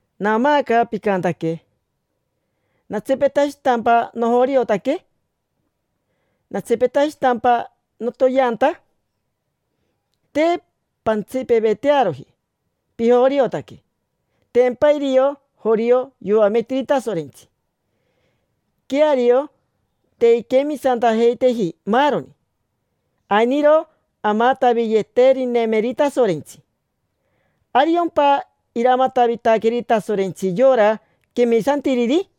Naamaaca picantaque: “¿Natsipetashitampa nojoriotaque? ¿Natsipetashitampa notoyeanta?” Te pantsipevetearoji pijoriotaque. Tempa irio jorio yoametiri Tasorentsi. Queario, te inquemisantajeiteji maaroni, ainiro amataviyeterinemeri Tasorentsi. ¿Ariompa iramatavitaqueri Tasorentsi yora quemisantiriri?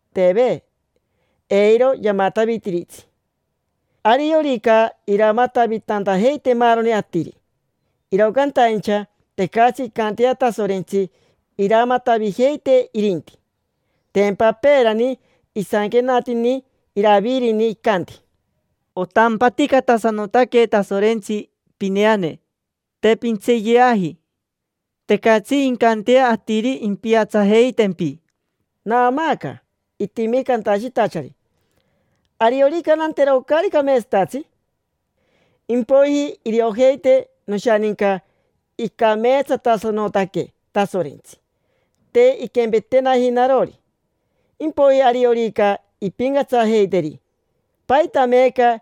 Teve, eiro yamatavitiritsi. Ariorica iramatavitantajeite maaroni atiri, iro cantaincha tecatsi incantea Tasorentsi iramatavijeitee irinti. Tempa peerani isanquenatini Iravirini, icanti: “Otampaticatasanotaque, Tasorentsi, pineane: te pintseeyaji. Tecatsi incantea atiri impiatsajeitempi”. Naamaaca itimi cantashitachari: “Ariorica nantero caari cameetsatatsi, impoiji iriojeite noshaninca icameetsatasanotaque Tasorentsi, te inquempetenaji narori. Impoiji ariorica impincatsajeiteri. ¿Paita meeca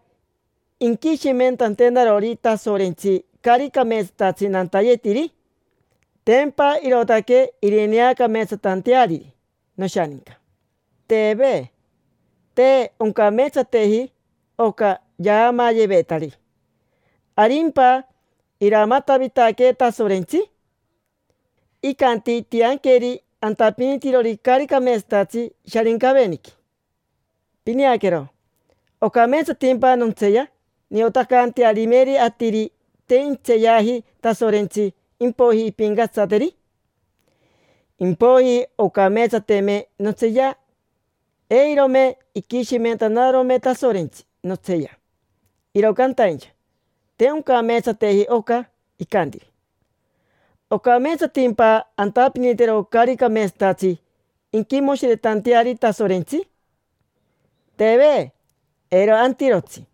inquishimentantenarori Tasorentsi caari cameetsatatsi nantayetiri? Tempa irootaque irineacameetsatanteariri noshaninca”. Teve. Te oncameetsateji oca yaamaayevetari. ¿Arimpa iramatavitaquee Tasorentsi? Icanti intianqueri antapinitirori caari cameetsatatsi Sharincaveniqui. Pineaquero, ¿ocameetsatimpa nontseeya niotacantearimeri atiri te intseeyaji Tasorentsi, impoiji impincatsateri? Impoiji oncameetsateme nontseeya, eirome iquishimentanarome Tasorentsi notseeya. Iro cantaincha, te oncameetsateji oca icantiri. ¿Ocameetsatimpa antapinitero caari cameetsatatsi inquimoshiretanteari Tasorentsi? Teve, eiro antirotsi.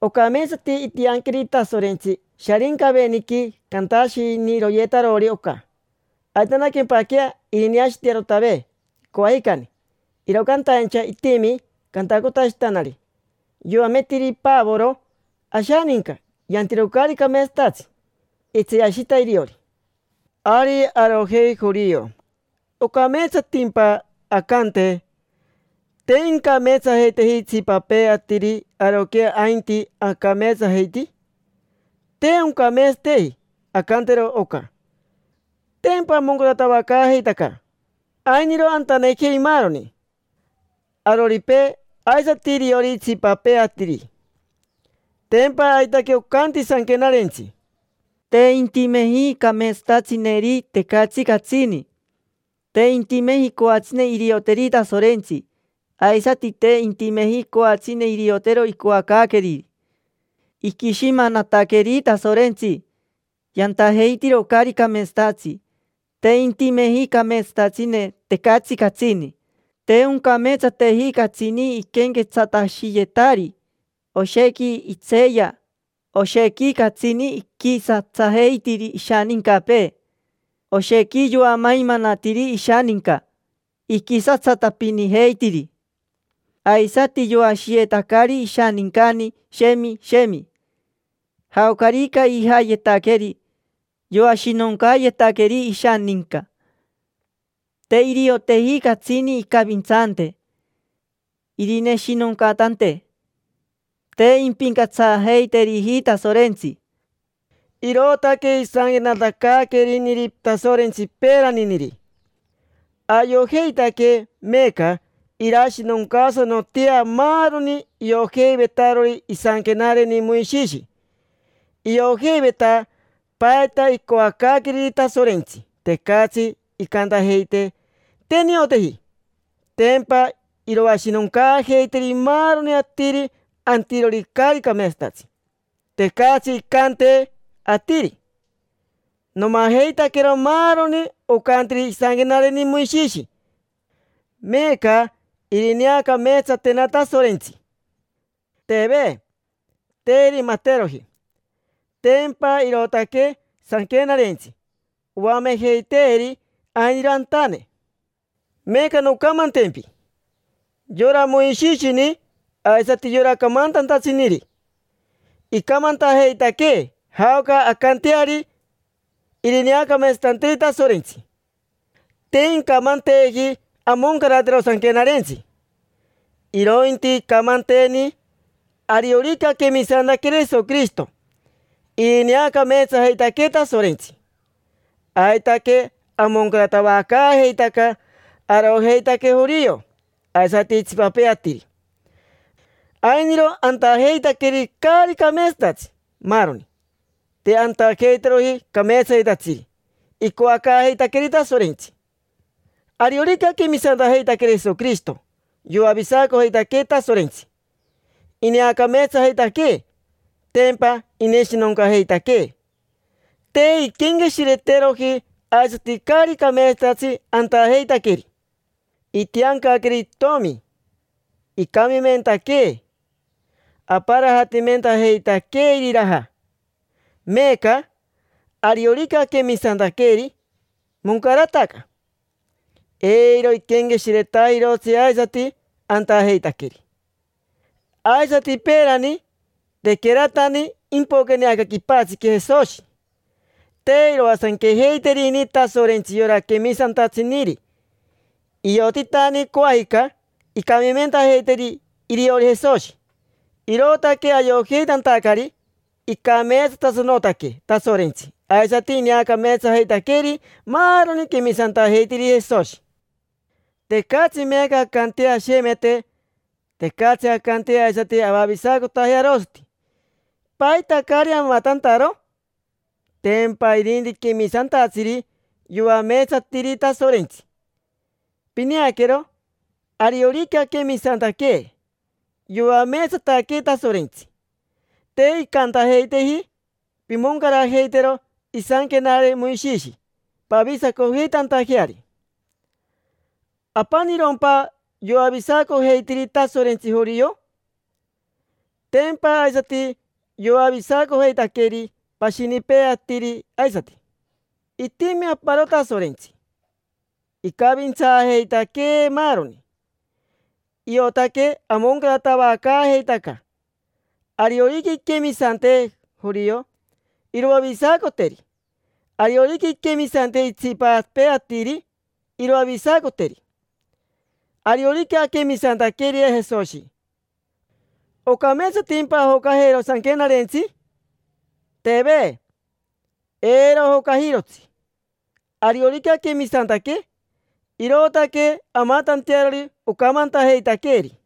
Ocameetsati intianqueri Tasorentsi Sharincaveniqui cantashiniroyetarori oca, aitanaquempaquea irineashiitetearotave coajicani. Iro cantaincha itimi cantacotashitanari: “Yoametiri Pavoro ashaninca yantiro caari cameetsatatsi”. Itseeyashita iriori. Ari arojei jorio. ¿Ocameetsatimpa ancante: “Te incameetsajeiteji itsipapee atiri, aroquea ainti, acameetsajeiti”? Te oncameetsateji ancantero oca. Tempa amoncaratavacaajeitaca, ainiro antanejei maaroni: aroripee, aisati iriori itsipapee atiri. Tempa aitaque ocanti Sanquenarentsi: “Te intimeji cameetsatatsineri, tecatsi catsini. Te intimeji coatsine irioteri Tasorentsi, aisati te intimeji coatsine iriotero icoacaaqueriri. Iquishimanataqueri Tasorentsi, yantajeitiro caari cameetsatatsi. Te intimeji cameetsatatsine, tecatsi catsini. Te oncameetsateji catsini iquenquetsatashiyetari. Oshequi itseeya. Oshequi catsini iquisatsajeitiri ishanincapee. Oshequi yoamaimanatiri ishaninca, iquisatsatapinijeitiri. Aisati yoashiyetacari ishanincani, shemi, shemi. Jaocarica ijayetaqueri, yoashinoncaayetaqueri ishaninca. Te irioteji catsini incavintsante, irineshinoncatante. Te impincatsajeiteriji Tasorentsi”. Irootaque isanquenatacaaqueriniri Tasorentsi peeraniniri. Ayojeitaque meeca irashinoncaasanotea maaroni iojeivetarori isanquenareni Moishishi. Iojeiveta paita icoacaaqueriri Tasorentsi, tecatsi incantajeite: “Te nioteji”. Tempa iroashinoncaajeiteri maaroni atiri antirori caari cameetsatatsi. Tecatsi incante atiri: “Nomajeitaquero maaroni ocantiri isanquenareni Moishishi, meeca irineacameetsatena Tasorentsi”. Teve, te irimateroji. Tempa irootaque Sanquenarentsi oamejeiteeri ainiro antane. Meeca noncamantempi: yora Moishishini aisati yora camantantatsiniri icamantajeitaquee jaoca ancanteari irineacameetsatanteeri Tasorentsi. Te incamanteeji amoncaratero Sanquenarentsi, irointi icamanteeni ariorica aquemisantaqueri Jesoquirishito, ineacameetsajeitaquee Tasorentsi. Aitaque amoncaratavacaajeitaca, arojeitaque jorio aisati itsipapee atiri: ainiro antajeitaqueri caari cameetsatatsi, maaroni. Te antajeiteroji cameetsayetatsiri icoacaajeitaqueeri Tasorentsi. Ariorica aquemisantajeitaqueri Jesoquirishito, yoavisacojeitaquee Tasorentsi, ineacameetsajeitaquee. Tempa ineshinoncajeitaquee: te inquenqueshireteroji aisati caari cameetsatatsi antajeitaqueri. Itiancaqueri itomi, icamimentaquee, aparajatimentajeitaquee iriraja. Meeca, ariorica aquemisantaqueri, moncarataca, eiro iquenqueshiretajirotsi aisati antajeitaqueri. Aisati peerani, tequeratani impoqueni aca quipatsiqui Jesoshi, te iroasanquejeiterini Tasorentsi yora quemisantatsiniri. Iotitani coajica incamimentajeiteri iriori Jesoshi. Irootaque ayojeitantacari icameetsatasanotaque Tasorentsi aisati ineacameetsajeitaqueri maaroni quemisantajeitiriri Jesoshi. Tecatsi meeca ancantea ashemete. Tecatsi ancantea aisati avavisacotajea arosati. ¿Paita caari amatantaro? Tempa irinti quemisantatsiri yoameetsatiri Tasorentsi. Pineaquero, ariorica aquemisantaque, yoameetsataquee Tasorentsi. Te incantajeiteeji: “Pimoncarajeitero isanquenare Moishishi pavisacojeitantajeari”. ¿Apanirompa yoavisacojeitiri Tasorentsi jorio? Tempa aisati yoavisacojeitaqueri pashinipee atiri aisati. Itimi aparoni Tasorentsi, icavintsaajeitaquee maaroni. Iotaque amoncaratavacaajeitaca. Ariorica inquemisante jorio, iroavisacoteri. Ariorica inquemisante itsipapee atiri, iroavisacoteri. Ariorica aquemisantaqueri Jesoshi, ¿ocameetsatimpa ajocajero Sanquenarentsi? Teve, eiro ajocajirotsi. Ariorica aquemisantaque, irootaque amatantearori ocamantajeitaqueeri.